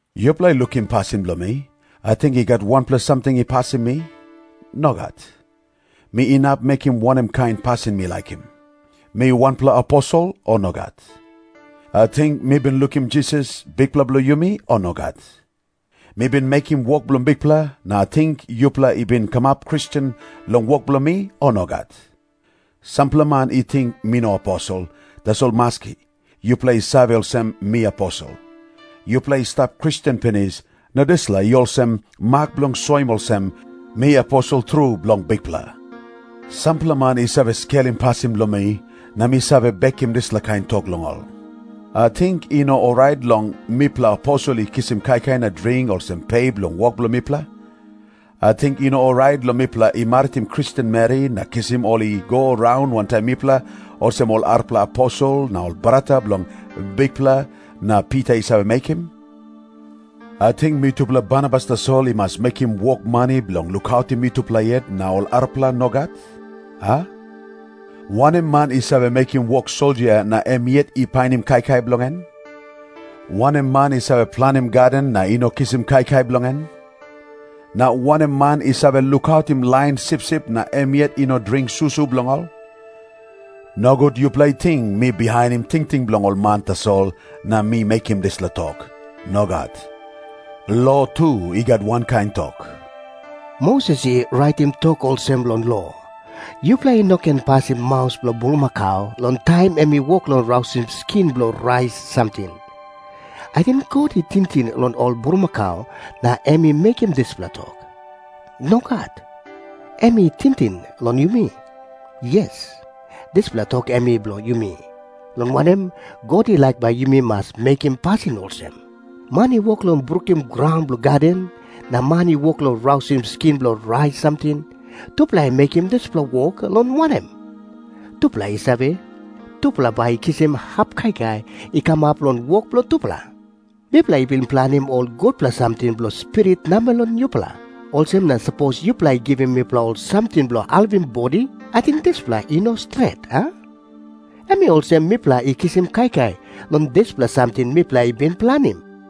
Yupela lukim pasin bilong mi. Ating i gat wanpela samting i pasim mi? Nogat. Mi inap mekim wanem kain pasin mi laikim. Mi wanpela aposel, o nogat? Ating mi bin lukim Jisas, Bikpela bilong yumi, o nogat? Mi bin mekim wok bilong Bikpela, na ating yupela i bin kamap Kristen long wok bilong mi, o nogat? Sampela man i ting mi no aposel, tasol maski, yupela i save olsem, mi aposel. Yupela i stap Kristen pinis, na dispela i olsem mak bilong soim olsem, mi aposel tru bilong Bikpela. Sampela man i save skelim pasin bilong mi, na mi save bekim dispela kain tok long ol. Ating i no orait long mipela aposel i kisim kaikai na dring olsem pe bilong wok bilong mipela? Ating i no orait long mipela i maritim Kristen meri na kisim ol i go raun wantaim mipela, olsem ol arapela aposel na ol brata bilong Bikpela na Pita i save mekim? Ating mitupela Barnabas tasol i mas mekim wok mani bilong lukautim mitupela yet, na ol arapela nogat, a? Wanem man i save mekim wok soldia na em yet i painim kaikai bilong en? Wanem man i save planim gaden na i no kisim kaikai bilong en? Na wanem man i save lukautim lain sipsip na em yet i no dring susu bilong ol? Nogut yupela i ting mi bihainim tingting bilong ol man tasol na mi mekim dispela tok. Nogat. Lo tu i gat wankain tok. Moses i raitim tok olsem long lo, "Yupela i no ken pasim maus bilong bulmakau long taim em i wok long rausim skin bilong rais samting." Ating God i tingting long ol bulmakau na em i mekim dispela tok? Nogat. Em i tingting long yumi. Yes, dispela tok em i bilong yumi, long wanem, God i laik bai yumi mas mekim pasin olsem. Man i wok long brukim graun bilong gaden, na man i wok long rausim skin bilong rais samting, tupela i mekim dispela wok, long wanem, tupela i save tupela bai i kisim hap kaikai i kamap long wok bilong tupela. Mipela i bin planim ol gutpela samting bilong spirit namel long yupela. Olsem na sapos yupela i givim mipela ol samting bilong helpim bodi, ating dispela i no stret, a? Em i olsem mipela i kisim kaikai long dispela samting mipela i bin planim.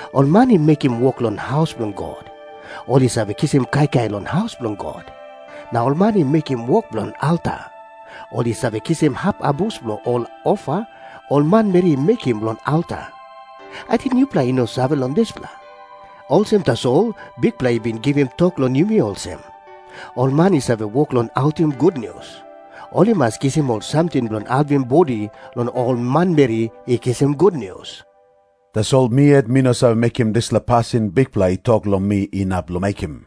Ol man i mekim wok long haus bilong God, ol i save kisim kaikai long haus bilong God. Na ol man i mekim wok bilong alta, ol i save kisim hap abus bilong ol ofa ol manmeri i mekim long alta. Ating yupela i no save long dispela? Olsem tasol Bikpela i bin givim tok long yumi olsem, ol man i save wok long autim gutnius, ol i mas kisim ol samting bilong helpim bodi long ol manmeri i kisim gutnius. Tasol mi yet mi no save mekim dispela pasin Bikpela i tok long mi inap long mekim.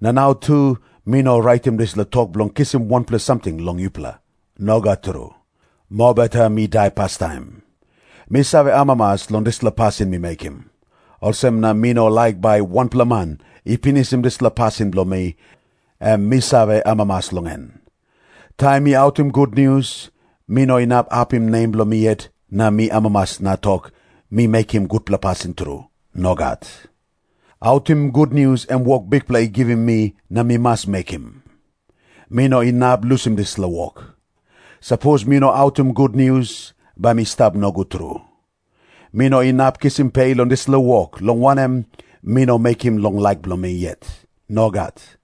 Na nau tu mi no raitim dispela tok bilong kisim wanpela samting long yupela. Nogat tru. Mobeta mi dai pastaim. Mi save amamas long dispela pasin mi mekim. Olsem na mi no laik bai wanpela man i pinisim dispela pasin bilong mi, em mi save amamas long en. Taim mi autim gutnius, mi no inap apim nem bilong mi yet na mi amamas na tok, mi mekim gutpela pasin tru. Nogat. Autim gutnius em wok Bikpela i givim mi na mi mas mekim. Mi no inap lusim dispela wok. Sapos mi no autim gutnius, bai mi stap nogut tru. Mi no inap kisim pe long dispela wok, long wanem, mi no mekim long laik bilong mi yet. Nogat.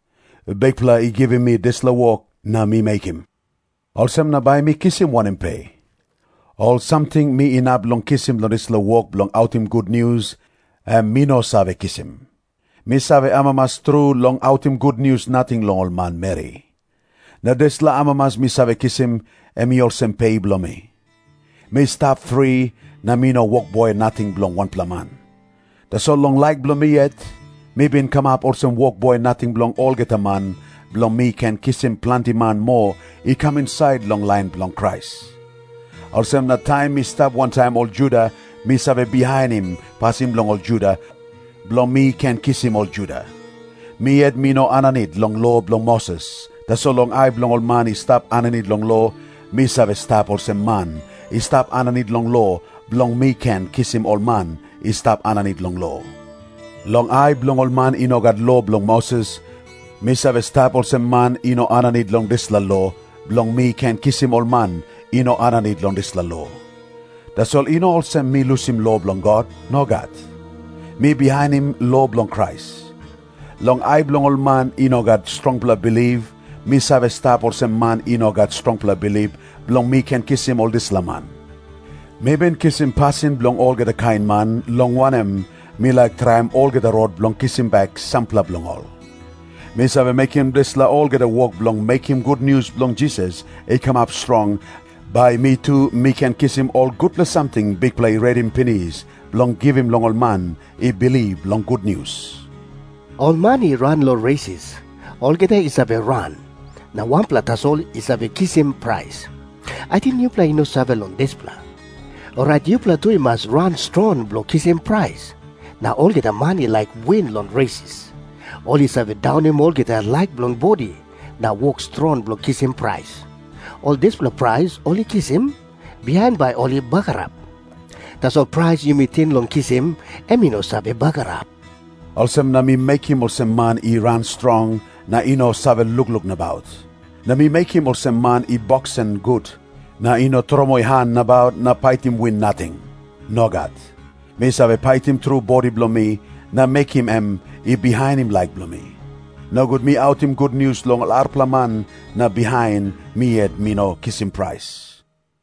Bikpela i givim mi dispela wok na mi mekim. Olsem na bai mi kisim wanem pe? Ol samting mi inap long kisim long dispela wok bilong autim gutnius, em mi no save kisim. Mi save amamas tru long autim gutnius nating long ol manmeri. Na dispela amamas mi save kisim, em i olsem pe bilong mi. Mi stap fri, na mi no wokboi nating bilong wanpela man. Tasol long laik bilong mi yet, mi bin kamap olsem wokboi nating bilong olgeta man, bilong mi ken kisim planti man moa i kam insait long lain bilong Krais. Olsem na taim mi stap wantaim ol Juda mi save bihainim pasin bilong ol Juda, bilong mi ken kisim ol Juda. Mi yet mi no aninit long lo bilong Moses, tasol long ai bilong ol man i stap aninit long lo, mi save stap olsem man i stap aninit long lo, bilong mi ken kisim ol man i stap aninit long lo. Long ai bilong ol man i no gat lo bilong Moses, mi save stap olsem man i no aninit long dispela lo, bilong mi ken kisim ol man i no aninit long dispela lo. Tasol i no olsem mi lusim lo bilong God. Nogat. Mi bihainim lo bilong Krais. Long ai bilong ol man i no gat strongpela bilip, mi save stap olsem man i no gat strongpela bilip, bilong mi ken kisim ol dispela man. Mi bin kisim pasin bilong olgeta kain man, long wanem, mi laik traim olgeta rot bilong kisim bek sampela bilong ol. Mi save mekim dispela olgeta wok bilong mekim gutnius bilong Jisas i kamap strong, bai mi tu mi ken kisim ol gutpela samting Bikpela i redim pinis bilong givim long ol man i bilip long gutnius. Ol man i ran long resis, olgeta i save ran, na wanpela tasol i save kisim prais. Ating yupela i no save long dispela? Orait yupela tu i mas ran strong bilong kisim prais. Na olgeta man i laik win long resis, ol i save daunim olgeta laik bilong bodi, na wok strong bilong kisim prais. Ol dispela prais ol i kisim, bihain bai ol i bagarap. Tasol prais yumi ting long kisim, em i no save bagarap. Olsem na mi mekim olsem man i ran strong, na i no save lukluk nabaut. Na mi mekim olsem man i boksen gut, na i no tromoi han nabaut na paitim win nating. Nogat. Mi save paitim tru bodi bilong mi na mekim em i bihainim laik bilong mi. Nogut mi autim gutnius long ol arapela man na bihain mi yet mi no kisim prais.